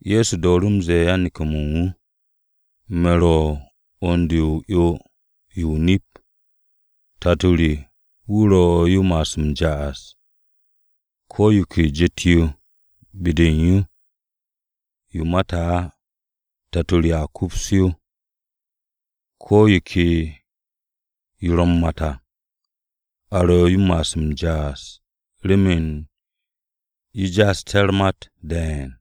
Ye̱so dooru̱ m-ze̱e̱ yan-neke̱-mo̱ u̱n wu̱, “Me̱ ro̱ 'wu̱n-de o-'yo yo o-nip. Tato re wu̱ ro̱ yo m-ma'as m-ja'as. Ko̱ yo ke jet-yo be-de u̱n yo, yo mate̱ á, Tato re a kups yo. Ko̱ yo ke yo ro̱ u̱r-mat à, a ro̱ yo m-ja'as remen yo ja'asté̱ u̱r-mat de̱e̱n.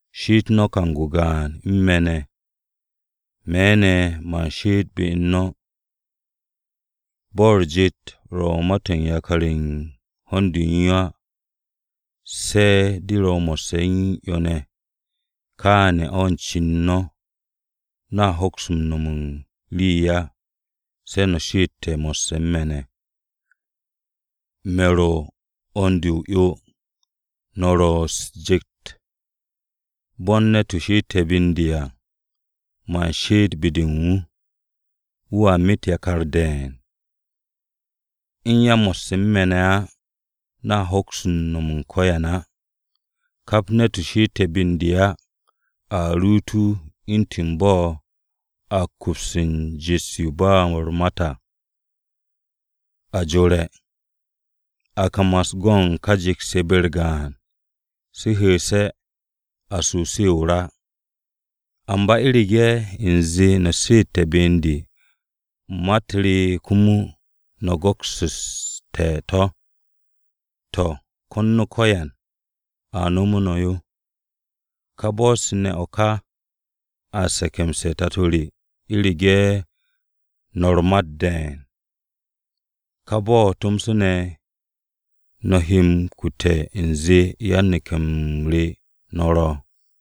She'et no̱ kang-o gaan u̱n me̱ ne̱, me̱ ne̱ man she'et be u̱n no̱. Bo̱ o-jet ro̱ m-mat u̱n yakar u̱n ho̱n-de u̱n yo á, se̱ de̱ yo ro mo̱sse̱ o-'yo ne̱. Kááne̱ o̱ u̱n cen no̱, no̱a hoks no̱m u̱n rii á, se̱ no̱ she'ette̱ mo̱sse̱ u̱n me̱ ne̱. “Me̱ ro̱ 'wu̱n-de o-'yo. No̱ ro̱ u̱s-jet. Bo̱ u̱n ne̱t-wu̱ she'ete̱ be u̱n de à, man she'et be-de u̱n wu̱, wu̱a met yakar de̱e̱n. U̱n ya mo̱sse̱ u̱n me̱ ne̱ á, no̱a hoks no̱m u̱n ko̱yan á. Kap ne̱t-wu̱ she'ete̱ be u̱n de á, a ruut wu̱ u̱ntu̱n bo̱ a m-kups u̱n jet-yo ba u̱r-mat á. A jore̱, a kamas go̱n ka jet-se be-u̱r gaan. Se hu̱'u̱se̱, a su se o-ra. Amba u̱rege̱ u̱nze no̱ she'ete̱ be u̱n de, ma-u̱t re komo, no̱ go̱kste̱ to̱, to̱, ko̱n no̱ ko̱yan, a nomu̱ no̱ yo. Ka bo̱-se ne̱ o̱ ka an se̱ke̱mse̱ u̱n Tato re u̱rege̱ no̱ u̱r-mat de̱e̱n. Ka bo̱-o̱ tomso no̱ he m-kute̱ u̱nze yan-neke̱-m re no̱ ro̱.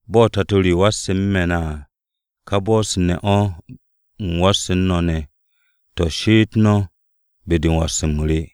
“Bo̱ Tato re wasse̱ u̱n me̱ ne̱ à, ka bo̱-se ne̱ o̱ u̱m wasse̱ u̱n no̱ ne̱. To̱, she'et no̱ be-de u̱n was-m re.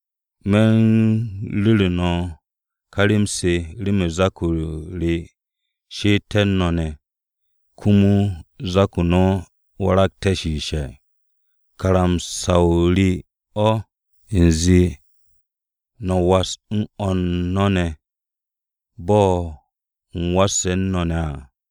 Me̱ u̱n ru̱re̱ no̱ ká rem-se remen zak-o re she'eté̱ u̱n no̱ ne̱, komo zak-o no̱ waragté̱ shiishe̱. Karamsa-o re o̱ u̱nze no̱ was u̱n o̱r no̱ ne̱, bo̱ u̱m wasse̱ u̱n no̱ ne̱ à.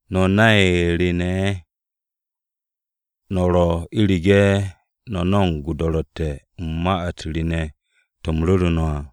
No̱ nay re ne̱ ye̱ no̱ ro̱ u̱rege̱ no̱ no̱mo̱g o-do̱ro̱tte̱ u̱n ma-u̱t re ne̱ to̱ u̱m ru̱ru̱ no̱ à.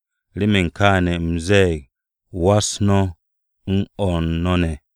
Remen kááne̱, u̱m ze̱e̱g: Was no̱ u̱n o̱r no̱ ne̱!”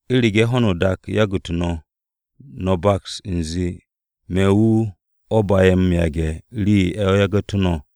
“U̱rege̱ ho̱no o-dak yagu̱tu̱ no̱, no̱ baks u̱nze me̱ wu̱ o̱ ba'e̱ m-yage̱ rii-yo o̱ yagu̱tu̱ no̱.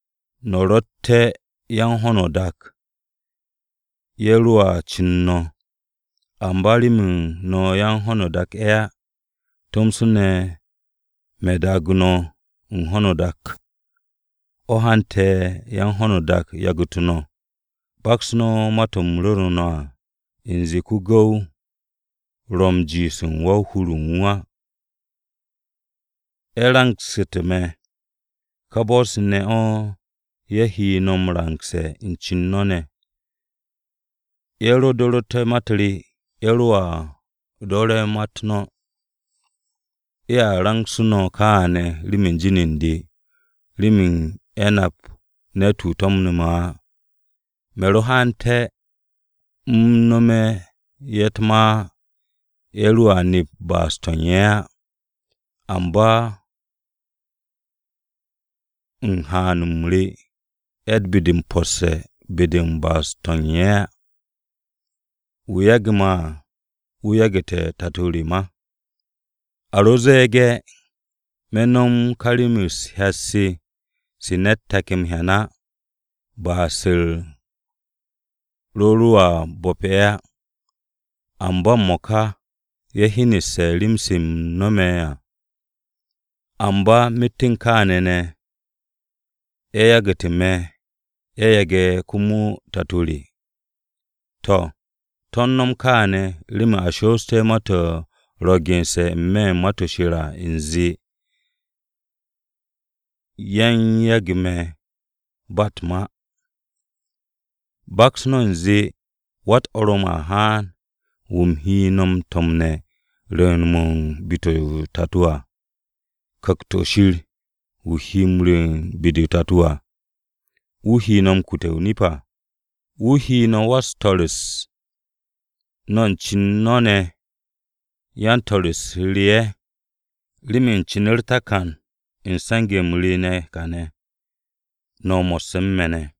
No̱ rotte̱ yan-ho̱no-o-dak, ye̱ roa cu̱n no̱. Amba remen no̱ yan-ho̱no-o-dak ye̱ á, tomso ne̱ me̱ daage̱ no̱ u̱n ho̱no o-dak, o̱ hante̱ yan-ho̱no-o-dak yagu̱tu̱ no̱. Baks no̱ ma-to̱ u̱m ru̱re̱ no̱ à, u̱nze ko-gu̱w ro̱ m-jiish u̱n wan-hur-o̱ u̱n wu̱ á. Ye̱ rangsu̱te̱ me̱, ka bo̱-se ne̱ o̱ ye̱ he no̱ m-rangse̱ u̱n cen no̱ ne̱. Ye̱ ro do̱ru̱te̱ ma-u̱t re, ye̱ roa do̱re̱ u̱t-ma no̱. Ye̱a rangsu̱ no̱ kááne̱ remen jin u̱n de, remen ye̱ nap ne̱t-wu̱ to̱mne̱ me̱ á. Me̱ ro haante̱, u̱m nome̱ ye̱ u̱t-ma á, ye̱ roa nep ba'as-to̱ u̱n ye̱ á. Amba u̱n haan-m re ye̱tt be-de m-posse̱ be-de u̱n ba'as-to̱ u̱n ye̱ á. Wu̱ yage̱ me̱ à, wu̱ yagu̱te̱ Tato re ma. A ro ze̱e̱ge̱ me̱ nom ka rem-se u̱t-hyat se, se ne̱t take̱ m-hyan á, ba'as-u̱r ro̱ roa bu̱p ye̱ á. Amba m-mo̱ka ye̱ hyeneste̱ rem-se u̱m nome̱ à, amba myet u̱n kááne̱ ne̱, ye̱ yagu̱tu̱ me̱ ye̱ yage̱ komo Tato re. To̱, to̱ u̱n no̱m kááne̱ remen a shoosté̱ ma-to̱ ro̱ gense̱ n-me̱ u̱n Ma-to̱ Shir à u̱nze, ‘Ye̱ u̱n yage̱ me̱ ba u̱t-ma.’ “Baks no̱ u̱nze Wa-u̱t-Orom a haan, wu̱ u̱m he no̱ m-to̱mne̱, rwu̱u̱n-mo̱ u̱n be-de o-Tato à. Ku̱kt-o̱ Shir wu̱ he m-rwu̱u̱n be-de o-Tato à, wu̱ he no̱ m-kute̱ o-nip à, wu̱ he no̱ wan-swo̱-u̱s. No̱ u̱n cen no̱ ne̱, ya yan-swo̱-u̱s re ye̱, remen cin u̱r-takan u̱n se̱nge̱-m re kàne̱, no̱ mo̱sse̱ u̱n me̱ ne̱.